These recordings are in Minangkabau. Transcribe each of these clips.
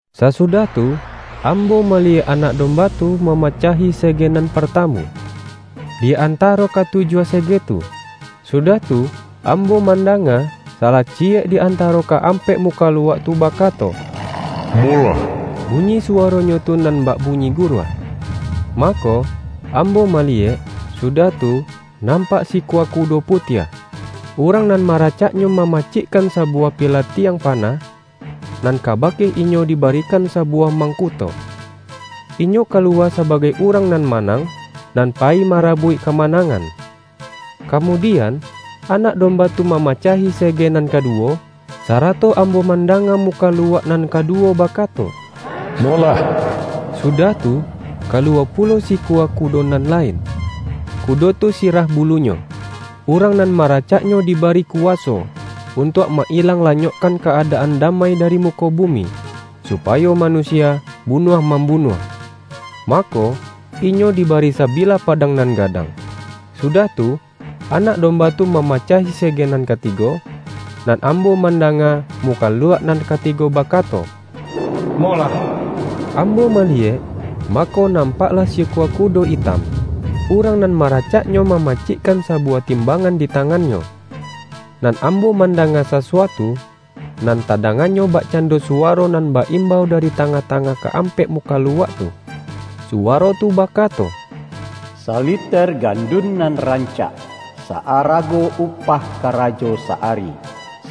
Sasudah tu, ambo maliyek Anak Domba tu mamacahi sege nan partamu, di antaro katujuah sege tu. Sudah tu, ambo mandanga, salah ci-yek di antaro ka-ampek mukaluak tu bakato,”Molah!” Bunyi suwaronyo tu nan bak bunyi guruah. Mako, am-bo maliyek, sudah tu, nampak sikua kudo putiah. Urang nan maracaknyo mamacikkan sabuwah pilatiang pa-nah, nan kabake inyo dibarikan sabu-wah mangkuto. Inyo kaluwa sabagai urang nan manang, nan payi mara-buik kamanangan. Kamudian, Anak Domba tu ma-macahi sege nan kaduwo, sarato am-bo mandanga mukaluak nan kaduwo bakato,”Molah!” Sudah tu, kaluwa pulo sikua kudo nan lain. Kudo tu si-rah bulunyo. Urang nan maracaknyo dibari kuwaso, untuak ma-ilang la-nyokkan ka-adaan damai dari muko bumi, supayo manusia bunuah mam-bunuah. Mako, inyo dibari sabilah pa-dang nan gadang. Sudah tu, Anak Domba tu mama-cahi sege nan katigo. Nan ambo man-danga mukaluak nan katigo bakato,”Molah!” Ambo maliyek, mako nam-paklah sikua kudo itam. Urang nan maracaknyo mamacikkan sabuwah timbangan di tangannyo. Nan ambo mandanga sasuatu, nan tadanganyo bakcando suwaro nan ba-imbau da-ri tangah-tangah ka-ampek mukaluak tu. Suwaro tu bakato,”Saliter gandun nan rancak, sa-arago upah karajo sa-ari,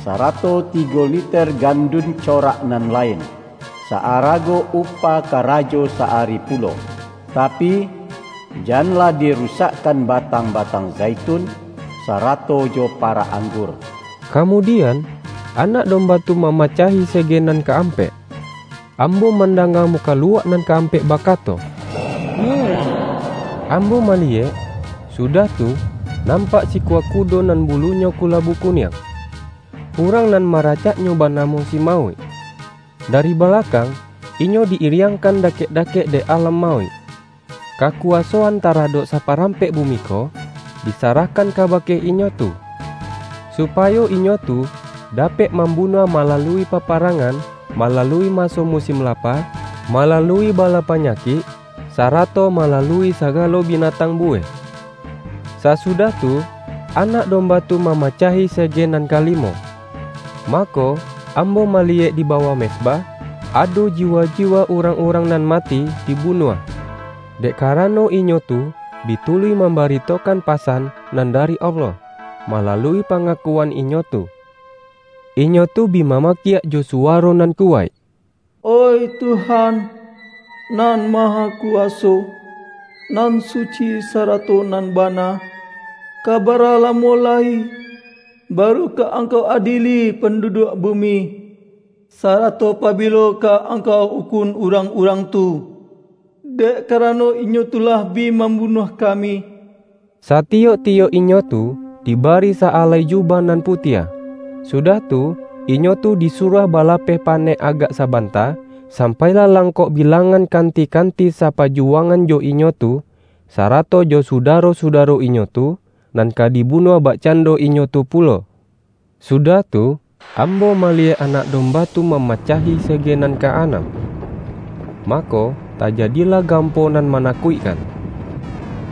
sarato tigo liter gandun corak nan lain, sa-arago upah karajo sa-ari pu-lo. Tapi, janlah dirusakkan batang-ba-tang zaitun, sarato jo parak anggur!” Kamudian, Anak Domba tu mama-cahi sege nan ka-ampek. Ambo man-danga mukaluak nan ka-ampek baka-to,”Molah!” Ambo maliyek, sudah tu, nampak sikua kudo nan bulunyo kulabu kuniang. Urang nan mara-caknyo banamo si Mauik. Dari bala-kang, inyo di-iriangkan dakek-dakek dek Alam Mauik. Kakuwasoan tara-dok saparampek bumi ko, disarahkan kabake inyo tu, supayo inyo tu da-pek mambunuah malalui paparang-an, malalui maso musin lapa, malalui bala panyakik, sarato malalui sagalo binatang buweh. Sasudah tu, Anak Domba tu mama-cahi sege nan kalimo. Mako, ambo ma-liyek di bawah mezbah, ado jiwa-jiwa urang-urang nan mati dibunuah, dek ka-rano inyo tu bi tuluih mambaritokan pa-san nan dari Allah, malalui pangakuan inyo tu. Inyo tu bi mamakiak jo suwa-ro nan kuwaik,”Oih Tuhan Nan Mahaku-waso, nan suci sarato nan bana! Ka bara lamo lai, baru ka Angkau adieli pandu-duak bumi, sarato pabilo ka Angkau ukun urang-urang tu, dek karano inyo tu lah bi mambunuah kami?” Satiyok-tiyok inyo tu dibari sa-alai jubah nan putiah. Sudah tu, inyo tu disuruah balapeh panek agak sabanta, sampai lah langkok bilang-an kanti-kanti sapajuwangan jo inyo tu, sarato jo sudaro-sudaro inyo tu, nan ka di-bunuah bakcando inyo tu pulo. Sudah tu, ambo maliyek Anak Dom-ba tu mamacahi sege nan ka-anam. Mako tajadilah gampo nan manakuikkan.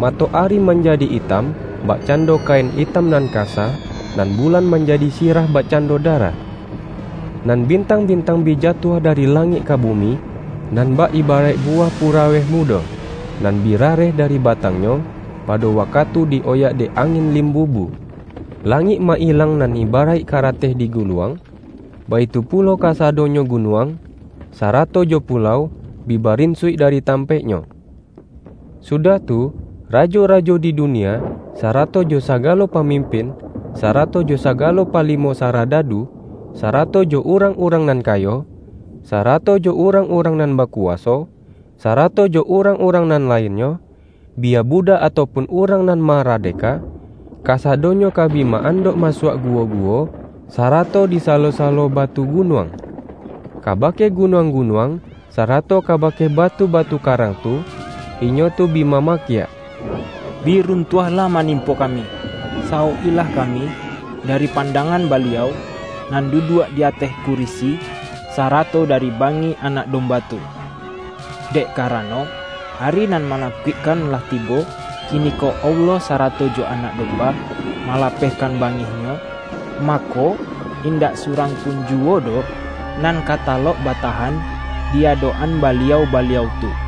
Mato-ari manjadi itam bakcando kain itam nan kasa, nan bulan manjadi sirah bakcando darah. Nan bintang-bintang bi jatuah dari langik ka bumi, nan bak ibaraik bu-wah puraweh mudo, nan bi rareh dari ba-tangnyo, pado wakatu di-oyak dek angin limbubu. Langik ma-ilang nan ibaraik karateh diguluang, baitu pulo kasadonyo gunuang, sarato jo pulau, bi barinsuik dari tampaiknyo. Sudah tu, rajo-rajo di du-nia, sarato jo sagalo pamimpin, sarato jo sagalo palimo saradadu, sarato jo urang-urang nan kayo, sarato jo urang-urang nan bakuwaso, sarato jo urang-urang nan lain-nyo, biya budak atau pun urang nan ma-radeka, kasadonyo ka bi ma-andok ma-suak guwo-guwo, sarato di salo-salo batu gunuang. Kabake gunuang-gunuang, sarato kabake batu-batu karang tu, inyo tu bi mamakiak,”Bi runtuahlah manimpo kami! Sawok-ilah kami dari pandangan Baliau nan duduak di ateh kurisi, sarato dari bangih Anak Domba tu! Dek kara-no, ari nan manakuikkan lah tibo, kiniko Allah sarato jo Anak Domba, malapehkan bangih-Nyo, mako, indak surang pun ju-wo doh nan ka talok batahan di adok-an Baliau-Baliau tu!”